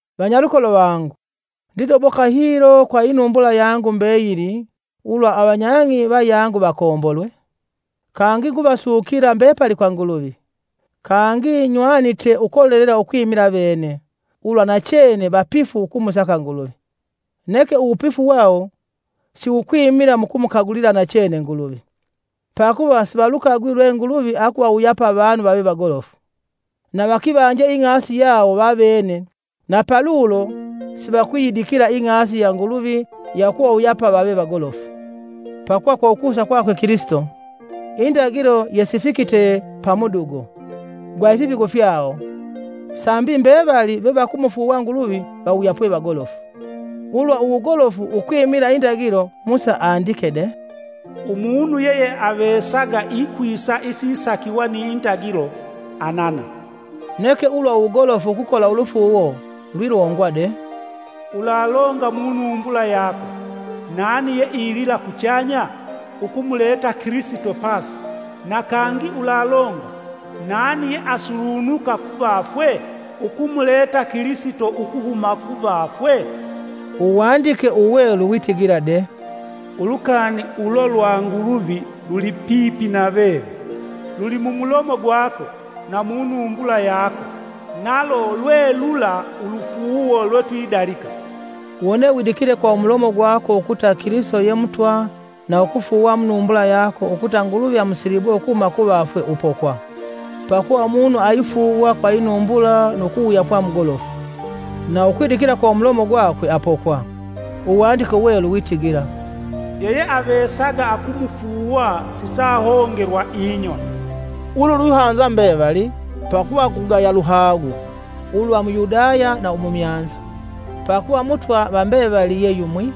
Vanyalukolo vangu, ndidoboka hilo kwa inumbula yangu mbeyili ulwa avanyang'i vayangu vakombolwe. Kangi nguvasukila mbepali kwa Nguluvi. Kangi nywanite ukolelela ukwimila avene, ulwa nachene vapifu ukumusaka Nguluvi, neke uwupifu wawo siwukwimila mukumukagulila nachene Nguluvi. Pakuva sivalukagwi lwe Nguluvi akuvawuyapa avanu vave vagolofu, na vakivanje ing'asi yawo vavene na palulo sivakuyidikila ing'asi ya Nguluvi ya ukuvawuyapa vave vagolofu. Pakuva kwa ukusa kwakwe Kilisito. Indagilo yesifikite pa mudugo, gwa ifipigo fyawo sambi mbevali vevakumufuuwa Nguluvi vawuyapwe vagolofu. Ulwa uwugolofu ukwimila indagilo Musa andike de: “Umunu yeyeavesaga ikwisa isisakiwa ni ndagilo anana.” Neke ulwa uwugolofu ukukola ulufuuwo, lwilongwa de: “Ulalonga munumbula yako: ‘Nani yeilila kuchanya?’” (ukumuleta Kilisito pasi); na kangi ulalonga: “Nani yeasulunuka kuvafwe?” (ukumuleta Kilisito ukuhuma kuvafwe?) Uwandike Uwelu witigila de, “Ulukani ulo lwa Nguluvi lulipipi na veve, luli mumulomo gwako na munumbula yako nalo lwe lula ulufuuwo lwetwidalika.” Wone widikile kwa umulomo gwako ukuta Kilisito ye Mutwa na ukufuuwa munumbula yako ukuta Nguluvi amusilibwe ukuhuma kuvafwe, upokwe. Pakuva umunu aifuuwa kwa inumbula nu kuwuyapwa mugolofu, na ukwidikila kwa umulomo gwakwe apokwe. Uwandike Uwelu witigila: “Yeyeavesaga akumufuuwa sisaahongelwa inyoni.” Ulu lwihanza mbevali, pakuva kugaya luhagu, ulwa Muyahudi na umumyanza, pakuva Mutwa va mbevali ye yumwi,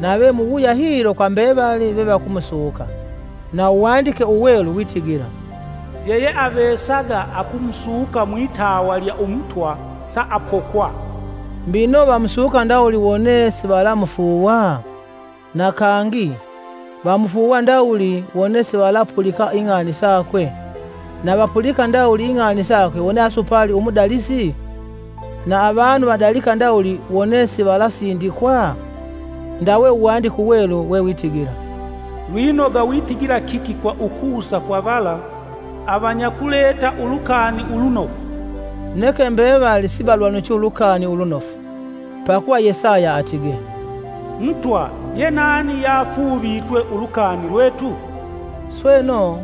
nave muwuya hilo kwa mbevali vevakumusuka. Na Uwandike Uwelu witigila: “Yeyeavesaga akumusuka mwitawa lya Umutwa saapokwa.” Mbino vamusuka ndawuli wone sivalamufuuwa? Na kangi; vamufuuwa ndawuli wone sivalapulika ing'ani sakwe? Na vapulika ndawuli ing'ani sakwe wone asupali umudalisi? Na avanu vadalika ndawuli wone sivalasindikwa? Ndawe Uwandike Uwelu wewitigila, “Lwinoga witigila kiki kwa ukusa kwa vala avanyakuleta Ulukani Ulunofu.” Neke mbevali sivalwanuchi Ulukani Ulunofu. Pakuva Yesaya atige, “Mutwa yenani yeafuuvitwe ulukani lwetu? Sweno,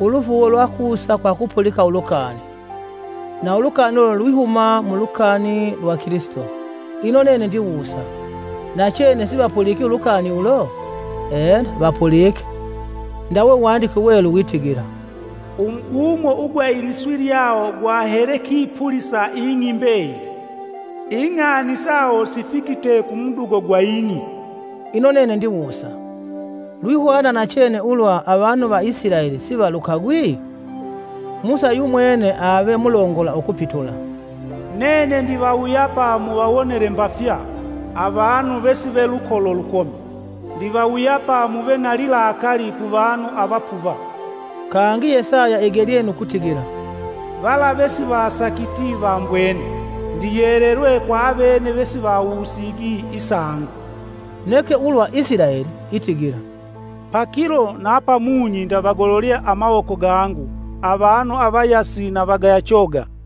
ulufuuwo lwakusa kwa kupulika ulukani, na ulukani ulo lwihuma mu lukani lwa Kilisito.” Ino nene ndiwusa: Nachene sivapuliki ulukani ulo? Ena vapulike: ndawe Uwandike Uwelu witigila: “Umubumo ugwa iliswi lyawo gwahele kipulisa ing'i mbeyili; ing'ani sawo sifikite kumudugo gwa ing'i.” Ino nene ndiwusa; lwihwana nachene ulwa avanu va Isilaeli sivalukagwi? Musa yumwene ave mulongola ukupitula: “Nene ndivawuyapa muvawonele mbafya, avanu vesive lukolo lukomi, ndivawuyapa muve na lilakali kuvanu avapuva.” Kangi Yesaya igelye nu kutigila; “Vala vesivasakiti vambwene; Ndiyelelwe kwa avene vesivawusigi isangu.” Neke ulwa Isilaeli itigila: “Pakilo na pamunyi ndavagololye amawoko gangu avanu avayasi na vagaya choga.”